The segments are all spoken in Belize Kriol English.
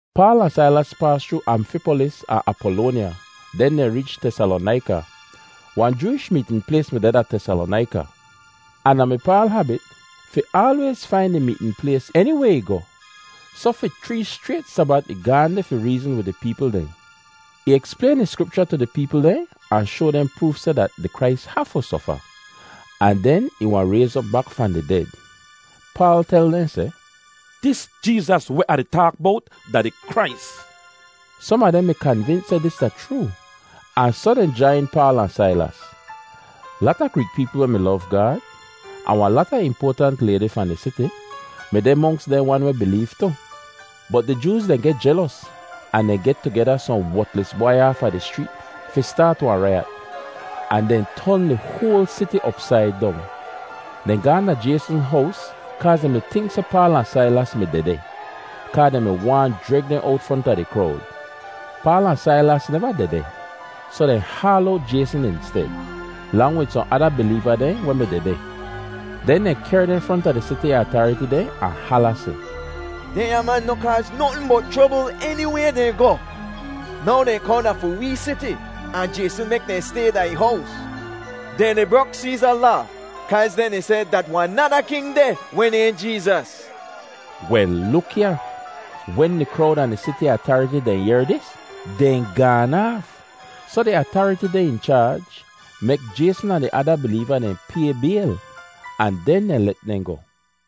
Paal ahn Sailas paas chroo Amfipolis ahn Apolonya, den dehn reech Tesalonaika. Wahn Jooish meetn plays mi deh da Tesalonaika, ahn da mi Paal habit fi aalwayz fain di meetn plays eniway ih goh, soh fi chree schrayt Sabat ih gaahn deh fi reezn wid di peepl dehn. Ih eksplayn di Skripcha tu di peepl dehn ahn shoa dehn proof seh dat di Krais hafu sofa, ahn den ih wahn rayz op bak fahn di ded. Paal tel dehn seh, “Dis Jeezas weh Ah di taak bowt da di Krais.” Som a dehn mi kanvins seh dis da chroo ahn soh dehn jain Paal ahn Sailas. Lata Greek peepl weh mi lov Gaad ahn wahn lata impoatant laydi fahn di siti mi deh monks dehn wan weh bileev tu. Bot di Jooz dehn geh jelos ahn dehn get tugeda sohn wotlis bwai aafa di schreet fi staat wahn raiyat, ahn dehn ton di hoal siti opsaid dong. Dehn gaahn da Jayson hows kaaz dehn mi tink seh Paal ahn Sailas mi dehdeh, kaa dehn mi waahn jreg dehn owt fronta di krowd. Paal ahn Sailas neva dehdeh, soh dehn haal owt Jayson insted, lang wid sohn ada bileeva dehn weh mi dehdeh. Den dehn kehr dehn fronta di siti atariti dehn ahn hala seh, “Dehnya man noh kaaz notn bot chrobl eniway dehn goh. Now dehn kohn da fi wee siti, ahn Jayson mek dehn stay da ih hows. Dehn di brok Seeza laa kaaz dehn di seh dat wahn nada king deh weh nayhn Jeezas.” Wel luk ya, wen di krowd ahn di siti atariti dehn yehr dis, dehn gaan aaf. Soh di atariti dehn in chaaj mek Jayson ahn di ada bileeva dehn pay bayl, ahn den dehn let dehn goh.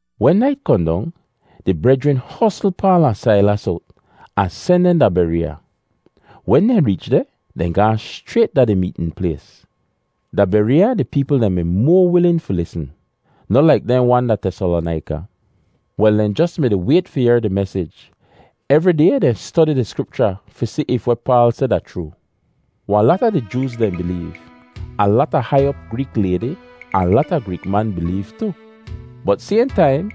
Wen nait kohn dong, di brejrin hosl Paal ahn Sailas owt, ahn sen dehn da Bereeya. Wen dehn reech deh, dehn gaahn schrayt da di meetn plays. Da Bereeya di peepl dehn mi moa wilin fi lisn, noh laik dehn wan da Tesalonaika. Wel, dehn jos mi-di wayt fi yehr di mesij. Evri day dehn stodi di Skripcha fi si if weh Paal seh da chroo. Wahn lata di Jooz dehn bileev, ahn lata hai op Greek laydi, ahn lata Greek man bileev tu. Bot sayhn taim,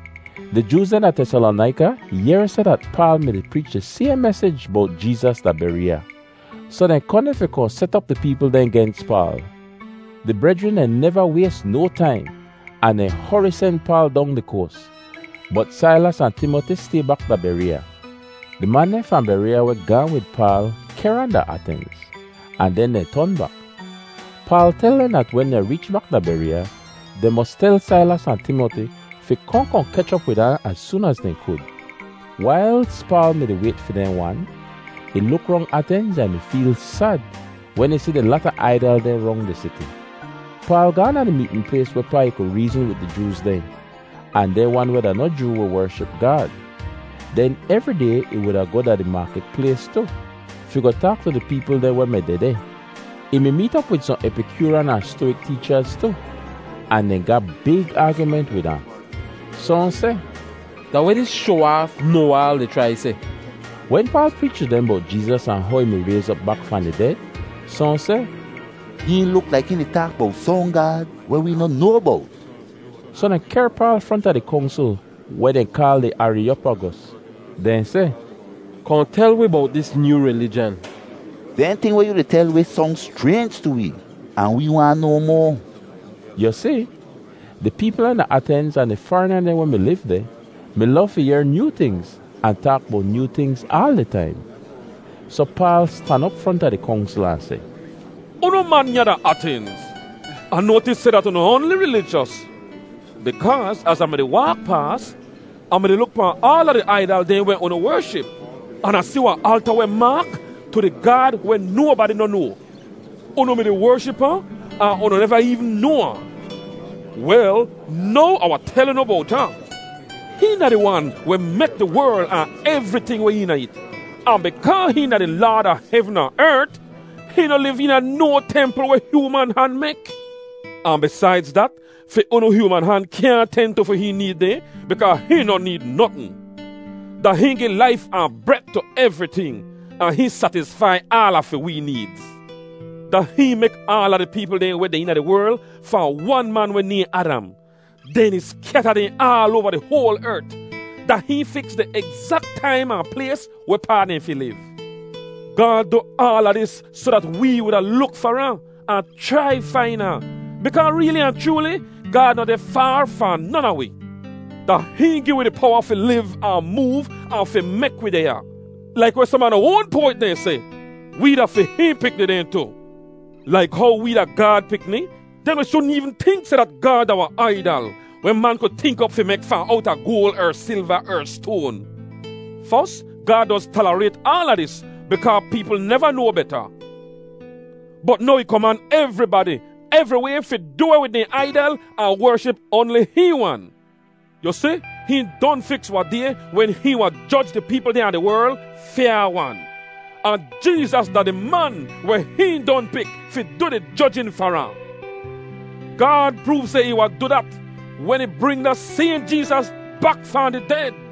di Jooz dehn da Tesalonaika yehr seh dat Paal mi-di preech di sayhn mesij bowt Jeezas da Bereeya, soh dehn kohn deh fi kohn set op di peepl dehn gens Paal. Di brejrin deh neva ways no taim, ahn dehn hori sen Paal dong di koas, bot Sailas ahn Timoti stay bak da Bereeya. Di man dehn fahn Bereeya weh gaahn wid Paal kehr ahn da Atenz, ahn den dehn ton bak. Paal tel dehn dat wen dehn reech bak da Bereeya, dehn mos tel Sailas ahn Timoti fi kohn kohn kech op wid ahn az soon az dehn kud. Wailz Paal mi-di wayt fi dehn wan, ih luk rong Atenz ahn ih mi feel sad wen ih si di lata aidal dehn rong di siti. Paal gaahn da di meetn plays wehpaa ih ku reezn wid di Jooz dehn ahn dehn wan weh da noh Joo weh wership Gaad. Den evri day ih wuda goh da di maakit plays tu fi goh taak tu di peepl dehn weh mi dehdeh. Ih mi meet op wid sohn Epikyooryan ahn Stowik teechaz tu, ahn dehn ga big aagyument wid ahn. Sohn seh, “Da weh dis shoa-aaf noa-aal di chrai seh?” Wen Paal preech tu dehn bowt Jeezas ahn how ih mi rayz op bak fahn di ded, sohn seh, “Hihn luk laik hihn di taak bowt sohn gaad weh wee noh noa bowt.” Soh dehn kehr Paal fronta di kongsl weh dehn kaal di Ariyopagos. Dehn seh, “Kohn tel wi bowt dis nyoo rilijan.” “Dehn ting weh yu di tel wi song schraynj tu wee, ahn wee waahn noa moa.” (Yu si, di peepl dehn a Atenz ahn di farina dehn weh mi liv deh, mi lov fi yehr nyoo tingz ahn taak bowt nyoo tingz aal di taim.) Soh Paal stan op fronta di kongsl ahn seh, “Unu man ya da Atenz, Ah noatis seh dat unu oanli rilijos bikaa az Ah mi-di waak paas, Ah mi-di luk pahn aala di aidal dehn weh unu wership, an Ah si wahn alta weh maak, ‘Tu di Gaad weh nobadi noh noa.’ Unu mi-di wership ahn, ahn unu neva eevn noa ahn. Wel, now Ah wahn tel unu bowt ahn. “Hihn da di Wan weh mek di werl ahn evriting weh eena it, ahn bikaa hihn da di Laad a hevn ahn ert, hihn noh liv eena no templ weh hyooman han mek. Ahn bisaidz dat, fi unu hyooman han kyaahn ten tu fi hihn need dehn bikaa hihn noh need notn. Da hihn gi laif ahn bret tu evriting, ahn hihn satisfai aala fi wee needz. Da hihn mek aala di peepl dehn weh deh eena di werl fahn wan man weh nayhn Adam. Den ih skyata dehn aal oava di hoal ert. Da hihn fiks di egzak taim ahn plays wehpaa dehn fi liv. Gaad du aala dis soh dat wee wuda luk far ahn, ahn chrai fain ahn, bikaa reeli ahn chrooli Gaad noh deh faar fahn non a wi. Da hihn gi wi di powa fi liv ahn moov ahn fi mek wi deh ya. Laik weh som a unu oan poawet dehn seh, ‘Wee da fi hihn pikni dehn tu.’ “Laik how wee da Gaad pikni, den wi shudn eevn tink seh dat Gaad da wahn aidal weh man ku tink op fi mek fahn owta goal er silva er stoan. Fos, Gaad doz talarayt aala dis bikaa peepl neva noa beta, bot now ih koman evribadi, evriway fi du weh wid dehn aidal ahn wership oanli hihn wan. Yu si, hihn don fiks wahn day wen hihn wahn joj di peepl dehn a di werl fyaa-wan. Ahn Jeezas da di man weh hihn don pik fi du di jojin far ahn. Gaad proov seh ih wahn du dat wen ih bring da sayhn Jeezas bak fahn di ded.”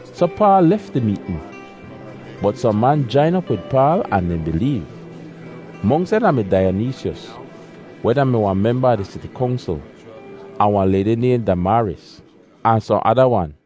Soh Paal lef di meetn. Bot sohn man jain op wid Paal ahn dehn bileev; monks dehn da mi Daiyonisyos, weh da-mi wahn memba a di siti kongsl, ahn wahn laydi nayhn Damaaris, ahn sohn ada wan.